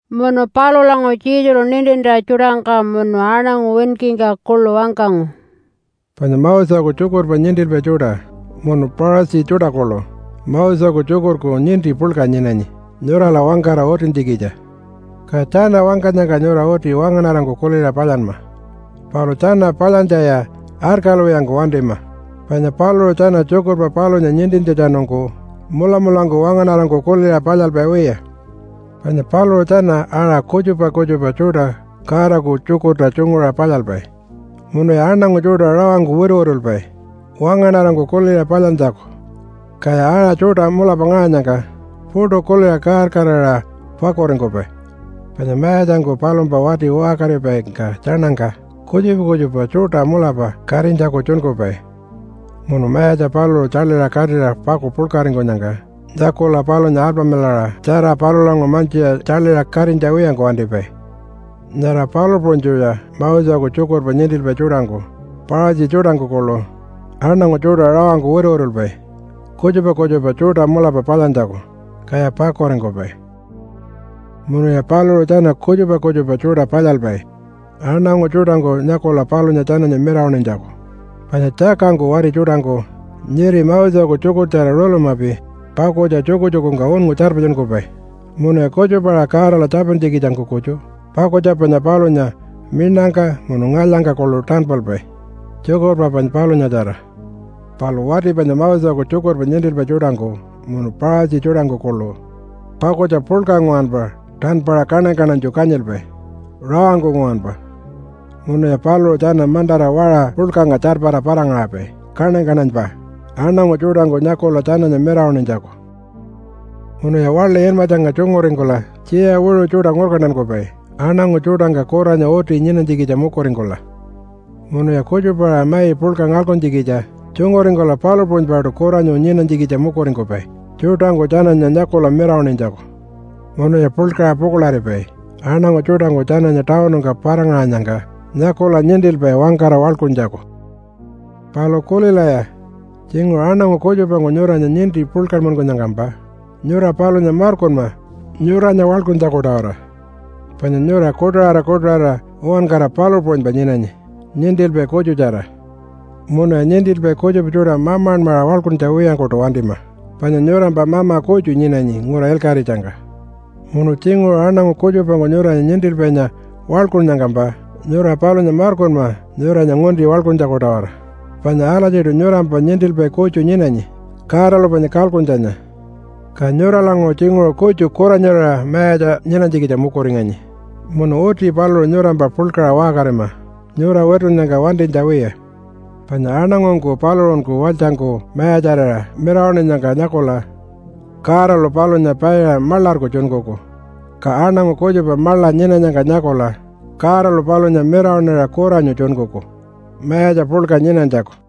Munu palulanguṟu Jesulu nintintja tjuṯangka munu aṉangu winkingka kuḻu wangkangu, “Panya Moseku tjukurpa nintilpai tjuṯa munu Paṟatji tjuṯa kuḻu Moseku tjukurku ninti puḻka nyinanyi nyurala wangkara utintjikitja. Ka tjana wangkanyangka nyura uti wangaṉarangku kuliṟa palyanma. Palu tjana palyantjaya arkalwiyangku wantima, panya paluṟu tjana tjukurpa palunya nintintjatjanungku mulamulangku wangaṉarangku kuliṟa palyalpai wiya. Panya paluṟu tjana aṟa kutjupa kutjupa tjuṯa Godaku tjukurta tjunguṟa palyalpai munuya aṉangu tjuṯa rawangku wituwitulpai wangaṉarangku kuliṟa palyantjaku, kaya aṟa tjuṯa mulapa ngaṟanyangka puṯu kuliṟa kaar-kaararira pakuringkupai. Panya mayatjangku palumpa wati waṟkaripaingka tjaṉangka kutjupa kutjupa tjuṯa mulapa katinytjaku tjunkupai munu mayatja paluṟu tjaḻiṟa katira paku puḻkaringkunyangka nyakula palunya alpamilaṟa tjara palulanguṟu mantjiṟa tjaḻiṟa katinytja wiyangku wantipai. Nyara palu puṟunytjuya Moseku tjukurpa nintilpai tjuṯangku Paṟatji tjuṯangku kuḻu aṉangu tjuṯa rawangku wituwitulpai kutjupa kutjupa tjuṯa mulapa palyantjaku, kaya pakuringkupai. “Munuya paluṟu tjana kutjupa kutjupa tjuṯa palyalpai aṉangu tjuṯangku nyakula palunya tjananya mirawaṉinytjaku, panya tjakangku wati tjuṯangku nyiri Moseku tjukurtjara rulumapi pakutja tjukutjukungka unngu tjarpatjunkupai munuya kutjupa-aṟa Godala tjapintjikitjangku kutju pakutja panya palunya miṉangka munu ngalyangka kuḻu tanpalpai tjukurpa panya palunyatjara, palu wati panya Moseku tjukurpa nintilpai tjuṯangku munu Paṟatji tjuṯangku kuḻu pakutja puḻka nguwanpa tanpaṟa kaṉany-kaṉanytju kanyilpai rawangku nguwanpa munuya paluṟu tjana mantara waṟa puḻkangka tjarpara para-ngaṟapai kaṉany-kaṉanypa aṉangu tjuṯangku nyakula tjananya mirawaṉinytjaku. “Munuya waḻi inmatjangka tjunguringkula tjiya wiṟu tjuṯa ngurkantankupai aṉangu tjuṯangka kuranyu uti nyinakatinytjikitja mukuringkula. Munuya kutjupa-aṟa mai puḻka ngalkuntjikitja tjunguringkula palu puṟunypaṯu kuranyu nyinanytjikitja mukuringkupai tjuṯangku tjananya nyakula mirawaṉinytjaku. Munuya puḻkaṟa pukuḻaripai aṉangu tjuṯangku tjananya tawunungka para-ngaṟanyangka nyakula nintilpai wangkara waḻkuntjaku. “Palu kulilaya! Tjinguṟu aṉangu kutjupangku nyuranya ninti puḻkanmankunyangkampa nyura palunya markunma nyuranya waḻkuntjaku-tawara, panya nyura kuṯaṟara kuṯaṟara uwankara palu puṟunypa nyinanyi nintilpai kutjutjara. Munuya nintilpai kutjupa tjuṯa mamanmaṟa waḻkuntja wiyangkuṯu wantima, panya nyurampa mama kutju nyinanyi ngura ilkaṟitjangka. Munu tjinguṟu aṉangu kutjupangku nyuranya ‘nintilpainya’ waḻkunnyangkampa nyura palunya markunma nyuranya ngunti waḻkuntjaku-tawara, panya alatjiṯu nyurampa ‘nintilpai’ kutju nyinanyi Godalu panya kalkuntjanya. Ka nyuralanguṟu tjinguṟu kutju kuranyurira mayatja nyinanytjikitja mukuringanyi munu uti paluṟu nyurampa puḻkaṟa waṟkarima nyura witunnyangka wantinytja wiya. Panya aṉangungku paluṟunku walytjangku mayatjarira mirawaṉinyangka nyakula Godalu palunya paiṟa maḻarku tjunkuku. Ka aṉangu kutjupa maḻa nyinanyangka nyakula Godalu palunya mirawaṉira kuranyu tjunkuku mayatja puḻka nyinanytjaku.”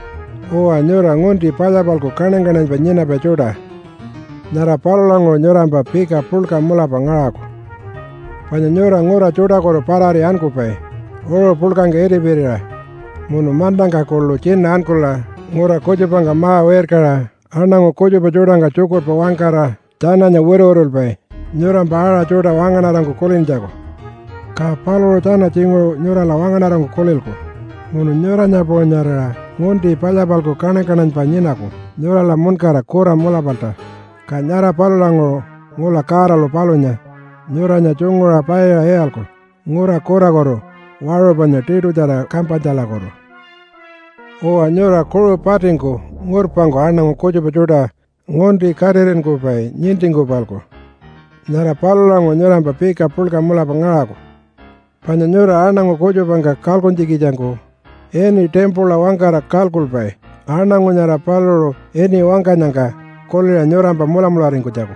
“Uwa, nyura ngunti palya-palku kaṉany-kaṉanypa nyinapai tjuṯa! Nyara palulanguṟu nyurampa pika puḻka mulapa ngaṟaku! Panya nyura ngura tjuṯakutu parari ankupai uṟu puḻkangka itipirira munu mantangka kuḻu tjina ankula ngura kutjupangka ma-wirkaṟa aṉangu kutjupa tjuṯangka tjukurpa wangkara tjananya wituwitulpai nyurampa aṟa tjuṯa wangaṉarangku kulintjaku, ka paluṟu tjana tjinguṟu nyurala wangaṉarangku kulilku munu nyuranya puṟunyarira ngunti palya-palku kaṉany-kaṉanypa nyinaku nyurala muṉkara kura mulapalta, ka nyara palulanguṟu ngula Godalu palunya nyuranya tjunguṟa paiṟa iyalku ngura kurakutu waṟu panya tiṯutjara kampanytjalakutu. “Uwa, nyura kuṟu patingku ngurpangku aṉangu kutjupa tjuṯa ngunti katiṟinkupai nintingku-palku! Nyara palulanguṟu nyurampa pika puḻka mulapa ngaṟaku! Panya nyura aṉangu kutjupangka kalkuntjikitjangku ini ‘timpula’ wangkara kalkulpai aṉangu nyara paluṟu ini wangkanyangka kuliṟa nyurampa mulamularingkunytjaku.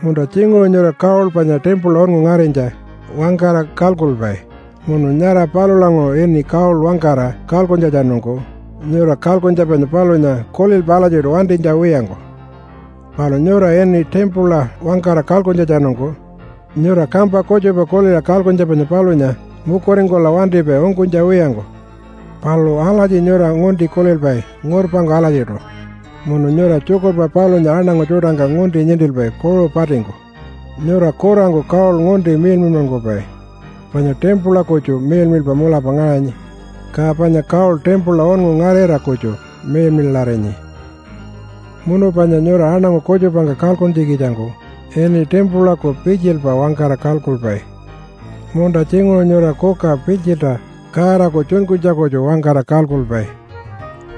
Munta tjinguṟu nyura ‘gold panya timpula unngu ngarinytja’ wangkara kalkulpai, munu nyara palulanguṟu ini ‘gold’ wangkara kalkuntjatjanungku nyura kalkuntja panya palunya kulilpai alatjiṯu wantinytja wiyangku. Palu nyura ini ‘timpula’ wangkara kalkuntjatjanungku nyura kampa kutjupa kuliṟa kalkuntja panya palunya mukuringkula wantipai ungkunytja wiyangku. Palu alatji nyura ngunti kulilpai ngurpangku alatjiṯu munu nyura tjukurpa palunya aṉangu tjuṯangka ngunti nintilpai kuṟu patingku. Nyura kurangku gold ngunti miḻmiḻmankupai, panya timpula kutju miḻmiḻpa mulapa ngaṟanyi, ka panya gold timpula unngu ngarira kutju miḻmiḻarinyi. “Munu panya nyura aṉangu kutjupangka kalkuntjikitjangku ini ‘timpulaku pitjilpa’ wangkara kalkulpai. Munta tjinguṟu nyura ‘kuka pitjilta Godaku tjunkunytja’ kutju wangkara kalkulpai.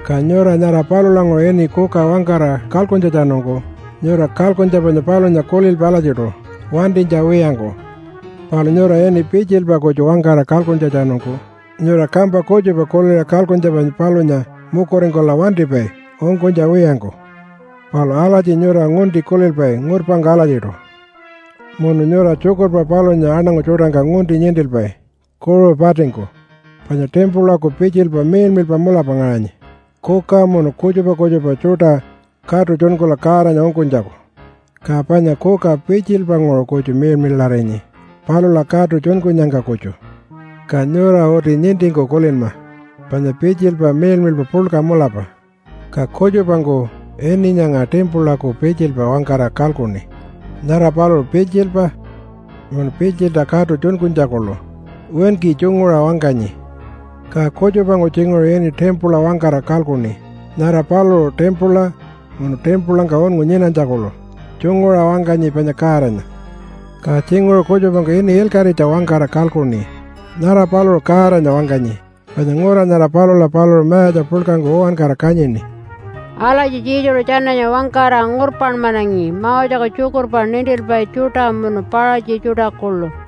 Ka nyura nyara palulanguṟu ini ‘kuka’ wangkara kalkuntjatjanungku nyura kalkuntja panya palunya kulilpai alatjiṯu wantinytja wiyangku. Palu nyura ini ‘pitjilpa’ kutju wangkara kalkuntjatjanungku nyura kampa kutjupa kuliṟa kalkuntja panya palunya mukuringkula wantipai ungkunytja wiyangku. Palu alatji nyura ngunti kulilpai ngurpangku alatjiṯu munu nyura tjukurpa palunya aṉangu tjuṯangka ngunti nintilpai kuṟu patingku. Panya timpulaku pitjilpa miḻmiḻpa mulapa ngaṟanyi kuka munu kutjupa kutjupa tjuṯa katu tjunkula Godanya ungkunytjaku, ka panya kuka pitjilpanguṟu kutju miḻmiḻarinyi palula katu tjunkunyangka kutju. Ka nyura uti nintingku kulinma panya pitjilpa miḻmiḻpa puḻka mulapa, ka kutjupangku ini nyanga ‘timpulaku pitjilpa’ wangkara kalkuṉi nyara paluṟu pitjilpa munu pitjilta katu tjunkunytja kuḻu winki tjunguṟa wangkanyi. Ka kutjupangku tjinguṟu ini ‘timpula’ wangkara kalkuṉi nyara paluṟu timpula munu timpulangka unngu nyinanytja kuḻu tjunguṟa wangkanyi panya Godanya. Ka tjinguṟu kutjupangku ini ‘ilkaṟitja’ wangkara kalkuṉi nyara paluṟu Godanya wangkanyi panya ngura nyara palula paluṟu mayatja puḻkangku uwankara kanyini.” Alatji Jesulu tjananya wangkara ngurpanmanangi Moseku tjukurpa nintilpai tjuṯa munu Paṟatji tjuṯa kuḻu.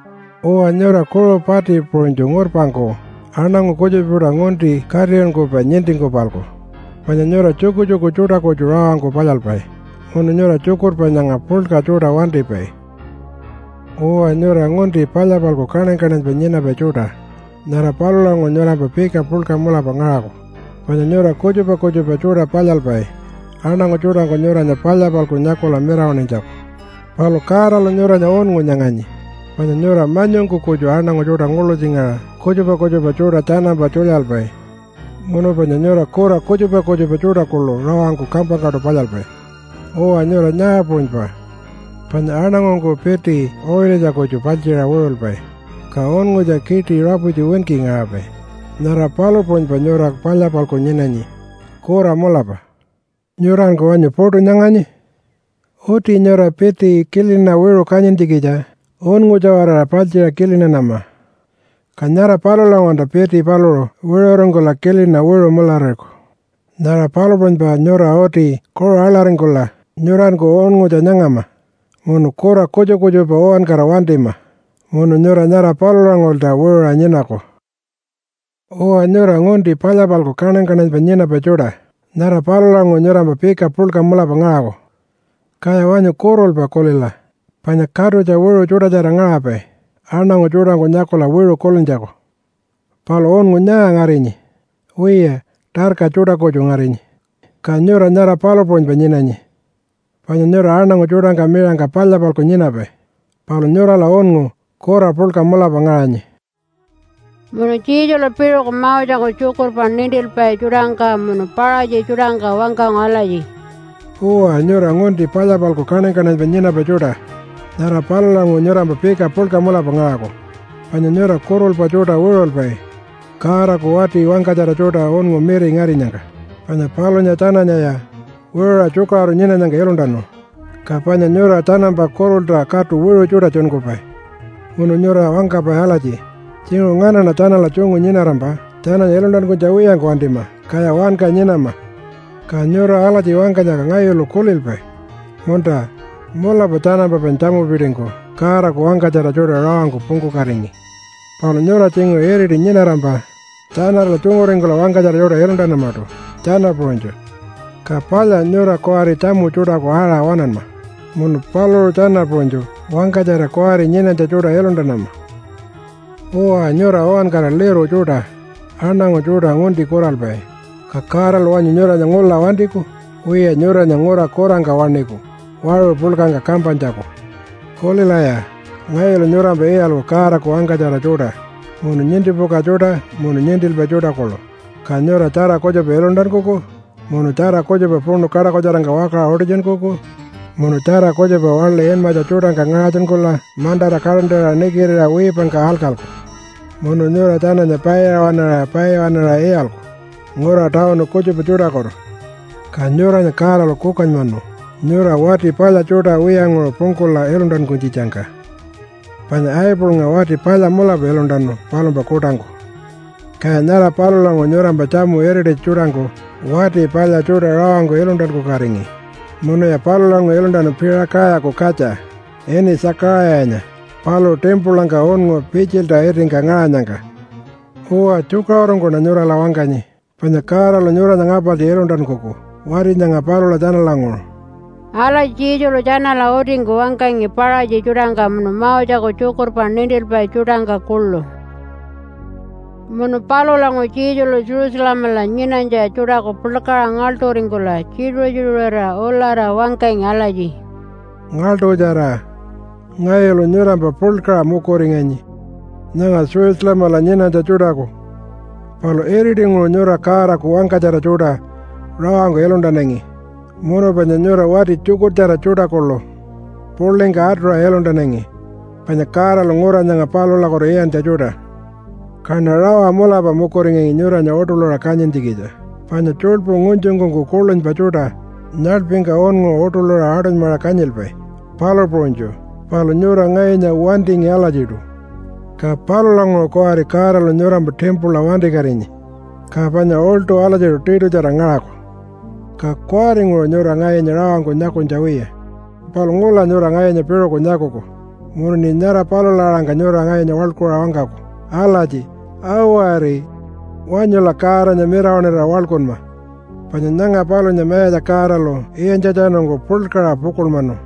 Uwa, nyura kuṟu pati puṟunytju ngurpangku aṉangu kutjupa tjuṯa ngunti katiṟinkupai nintingku-palku, panya nyura tjukutjuku tjuṯa kutju rawangku palyalpai munu nyura tjukurpa nyanga puḻka tjuṯa wantipai. “Uwa, nyura ngunti palya-palku kaṉany-kaṉanypa nyinapai tjuṯa! Nyara palulanguṟu nyurampa pika puḻka mulapa ngaṟaku! Panya nyura kutjupa kutjupa tjuṯa palyalpai aṉangu tjuṯangku nyuranya palya-palku nyakula mirawaṉinytjaku. Palu Godalu nyuranya unngu nyanganyi panya nyura manyungku kutju aṉangu tjuṯa nguḻutjingaṟa kutjupa kutjupa tjuṯa tjanampa tjulyalpai, munu panya nyura kura kutjupa kutjupa tjuṯa kuḻu rawangku kampangkaṯu palyalpai. Uwa, nyura nyaa puṟunypa panya aṉangungku piti uṟilitja kutju paltjiṟa wiṟulpai ka unngutja kiṯi raputji winki ngaṟapai, nyara palu puṟunypa nyura palya-palku nyinanyi kura mulapa. Nyuranku wanyu puṯu nyanganyi? Uti nyura piti kilina wiṟu kanyintjikitja unngutja-waraṟa paltjiṟa kilinanama, ka nyara palulanguṟulta piti paluṟu wiṟuringkula kilina wiṟu mularariku. Nyara palu puṟunypa nyura uti kuṟu aḻaringkula nyuranku unngutja nyangama munu kura kutjupa kutjupa uwankara wantima, munu nyura nyara palulanguṟulta wiṟuṟa nyinaku. “Uwa, nyura ngunti palya-palku kaṉany-kaṉanypa nyinapai tjuṯa! Nyara palulanguṟu nyurampa pika puḻka mulapa ngaṟaku! Kaya wanyu kurulpa kulila, panya katutja wiṟu tjuṯatjara ngaṟapai aṉangu tjuṯangku nyakula wiṟu kulintjaku, palu unngu nyaa ngarinyi? Wiya, tarka tjuṯa kutju ngarinyi. Ka nyura nyara palu puṟunypa nyinanyi, panya nyura aṉangu tjuṯangka miṟangka palya-palku nyinapai, palu nyurala unngu kura puḻka mulapa ngaṟanyi.” Munu Jesulu piṟuku Moseku tjukurpa nintilpai tjuṯangka munu Paṟatji tjuṯangka wangkangu alatji, “Uwa, nyura ngunti palya-palku kaṉany-kaṉanypa nyinapai tjuṯa! Nyara palulanguṟu nyurampa pika puḻka mulapa ngaṟaku! Panya nyura kurulpa tjuṯa wiṟulpai Godaku wati wangkatjara tjuṯa unngu miri ngarinyangka. Panya palunya tjananyaya wiṟuṟa tjukaṟuru nyinanyangka iluntanu, ka panya nyura tjanampa kurulta katu wiṟu tjuṯa tjunkupai. Munu nyura wangkapai alatji, ‘Tjinguṟu nganaṉa tjanala tjungu nyinarampa tjananya iluntankunytja wiyangku wantima, kaya wanka nyinama.’ Ka nyura alatji wangkanyangka ngayulu kulilpai, ‘Munta, mulapa tjanampa panya tjamupitingku Godaku wangkatjara tjuṯa rawangku pungkukatingi.’ Palu nyura tjinguṟu iriti nyinarampa tjanala tjunguringkula wangkatjara tjuṯa iluntanamaṯu tjana puṟunytju. Ka palya nyura kuwari tjamu tjuṯaku aṟa waṉanma, munu paluṟu tjana puṟunytju wangkatjara kuwari nyinanytja tjuṯa iluntanama. “Uwa, nyura uwankara liru tjuṯa aṉangu tjuṯa ngunti kuralpai, ka Godalu wanyu nyuranya ngula wantiku? Wiya, nyuranya ngura kurangka waṉiku waṟu puḻkangka kampanytjaku. Kulilaya! Ngayulu nyurampa iyalku Godaku wangkatjara tjuṯa munu nintipuka tjuṯa munu nintilpai tjuṯa kuḻu, ka nyura tjara kutjupa iluntankuku munu tjara kutjupa puṉu kaṯakutjarangka wakaṟa utitjunkuku, munu tjara kutjupa waḻi inmatja tjuṯangka ngaṟatjunkula mantara kaṯantaṟa nikitiṟa wiipangka alkalku. Munu nyura tjananya paiṟa waṉaṟa paiṟa waṉaṟa iyalku ngura tawunu kutjupa tjuṯakutu. Ka nyuranya Godalu kukanymanu nyura wati palya tjuṯa wiyanguṟu pungkula iluntankunytjitjangka. Panya Abelnga wati palya mulapa iluntanu palumpa kuṯangku, kaya nyara palulanguṟu nyurampa tjamu irititja tjuṯangku wati palya tjuṯa rawangku iluntankukatingi munuya palulanguṟu iluntanu Piṟakayaku katja ini Tjakaṟayanya paluṟu timpulangka unngu pitjilta itingka ngaṟanyangka. Uwa, tjukaṟurungkuṉa nyurala wangkanyi panya Godalu nyuranya ngapartji iluntankuku wati nyanga palula tjanalanguṟu.” Alatji Jesulu tjanala utingku wangkangi Paṟatji tjuṯangka munu Moseku tjukurpa nintilpai tjuṯangka kuḻu. Munu palulanguṟu Jesulu Jerusalemala nyinanytja tjuṯaku puḻkaṟa ngaḻṯuringkula tjituṟu-tjituṟurira ulara wangkangi alatji, “Ngaḻṯutjara! Ngayulu nyurampa puḻkaṟa mukuringanyi nyanga Jerusalemala nyinanytja tjuṯaku. Palu iritinguṟu nyura Godaku wangkatjara tjuṯa rawangku iluntanangi munu panya nyura wati tjukurtjara tjuṯa kuḻu puḻingka atuṟa iluntanangi panya Godalu ngura nyanga palulakutu iyantja tjuṯa. Kaṉa rawa mulapa mukuringangi nyuranya uṯuḻuṟa kanyintjikitja, panya tjuḻpu ngunytjungkunku kuḻunypa tjuṯa nyaḻpingka unngu uṯuḻuṟa aṯunymaṟa kanyilpai, palu puṟunytju. Palu nyura ngayunya wantingi alatjiṯu. Ka palulanguṟu kuwari Godalu nyurampa timpula wantikatinyi, ka panya uḻṯu alatjiṯu tiṯutjara ngaṟaku. Ka kuwaringuṟu nyura ngayunya rawangku nyakunytja wiya. Palu ngula nyura ngayunya piṟuku nyakuku munuṉi nyara palula aṟangka nyura ngayunya waḻkuṟa wangkaku alatji, ‘Awari! Wanyula Godanya mirawaṉira waḻkunma, panya nyanga palunya Mayatja Godalu iyantjatjanungku puḻkaṟa pukuḻmanu.’”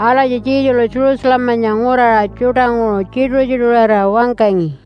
Alatji Jesulu Jerusalemanya nguraṟa tjuṯanguṟu tjituṟu-tjituṟurira wangkangi.